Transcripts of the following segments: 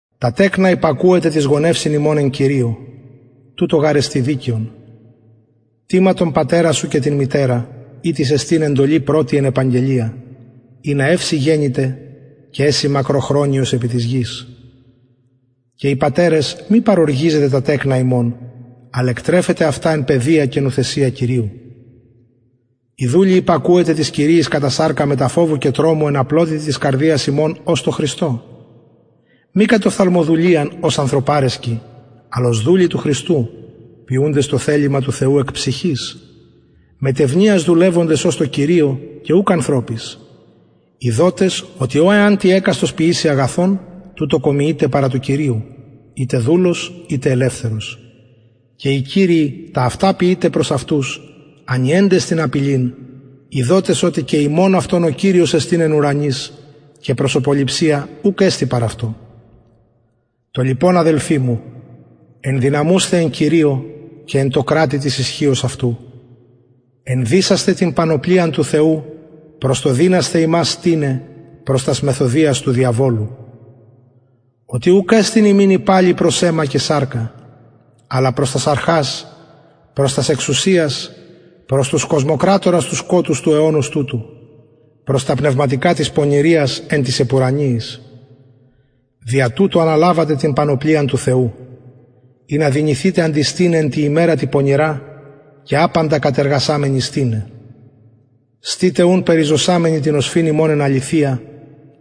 τα τεκνα υπακουετε τοις γονευσιν υμων εν κυριω τουτο γαρ εστιν δικαιον τιμα τον πατερα σου και την μητερα ητις εστιν εντολη πρωτη εν επαγγελια ινα ευ σοι γενηται και εση μακροχρονιος επι της γης και οι πατερες μη παροργιζετε τα τεκνα υμων αλλ εκτρεφετε αυτα εν παιδεια και νουθεσια κυριου οι δουλοι υπακουετε τοις κυριοις κατα σαρκα μετα φοβου και τρομου εν απλοτητι της καρδιας υμων ως τω χριστω μη κατ οφθαλμοδουλειαν ως ανθρωπαρεσκοι αλλ ως δουλοι του χριστου ποιουντες το θελημα του θεου εκ ψυχης μετ ευνοιας δουλευοντες ως τω κυριω και ουκ ανθρωποις ειδοτες οτι ο εαν τι εκαστος ποιηση αγαθον τουτο κομιειται παρα του κυριου ειτε δουλος ειτε ελευθερος και οι κυριοι τα αυτα ποιειτε προς αυτους ανιεντες την απειλην ειδοτες οτι και υμων αυτων ο κυριος εστιν εν ουρανοις και προσωποληψια ουκ εστιν παρ αυτω το λοιπον αδελφοι μου ενδυναμουσθε εν κυριω και εν τω κρατει της ισχυος αυτου ενδυσασθε την πανοπλιαν του θεου προς το δυνασθαι υμας στηναι προς τας μεθοδειας του διαβολου οτι ουκ εστιν ημιν η παλη προς αιμα και σαρκα αλλα προς τας αρχας προς τας εξουσιας προς τους κοσμοκρατορας του σκοτους του αιωνος τουτου προς τα πνευματικα της πονηριας εν τοις επουρανιοις δια τουτο αναλαβετε την πανοπλιαν του θεου ινα δυνηθητε αντιστηναι εν τη ημερα τη πονηρα και απαντα κατεργασαμενοι στηναι στητε ουν περιζωσαμενοι την οσφυν υμων εν αληθεια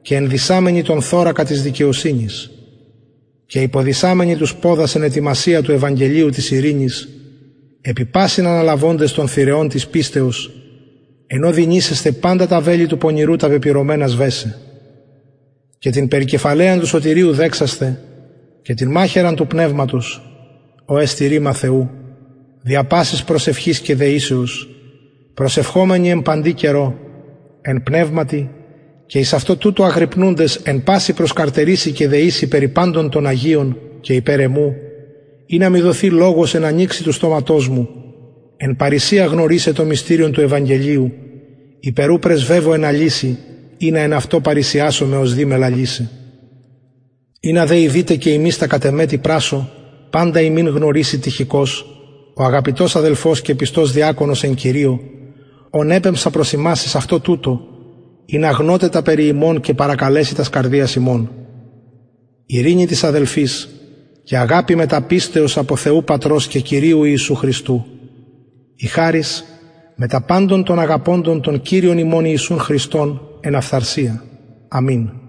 και ενδυσαμενοι τον θωρακα της δικαιοσυνης και υποδησαμενοι τους ποδας εν ετοιμασια του ευαγγελιου της ειρηνης επι πασιν αναλαβοντες τον θυρεον της πιστεως εν ω δυνησεσθε παντα τα βελη του πονηρου τα πεπυρωμενα σβεσαι και την περικεφαλαιαν του σωτηριου δεξασθαι και την μαχαιραν του πνευματος ο εστιν ρημα θεου δια πασης προσευχης και δεησεως προσευχομενοι εν παντι καιρω εν πνευματι και εις αυτο τουτο αγρυπνουντες εν παση προσκαρτερησει και δεησει περι παντων των αγιων και υπερ εμου ινα μοι δοθη λογος εν ανοιξει του στοματος μου εν παρρησια γνωρισαι το μυστηριον του ευαγγελιου υπερ ου πρεσβευω εν αλυσει ινα εν αυτω παρρησιασωμαι ως δει με λαλησαι ινα δε ειδητε και υμεις τα κατ εμε τι πρασσω παντα υμιν γνωρισει τυχικος ο αγαπητος αδελφος και πιστος διακονος εν κυριω ον επεμψα προς υμας εις αυτο τουτο ινα γνωτε τα περι ημων και παρακαλεση τας καρδιας υμων ειρηνη τοις αδελφοις και αγαπη μετα πιστεως απο θεου πατρος και κυριου ιησου χριστου η χαρις μετα παντων των αγαπωντων τον κυριον ημων ιησουν χριστον εν αφθαρσια αμην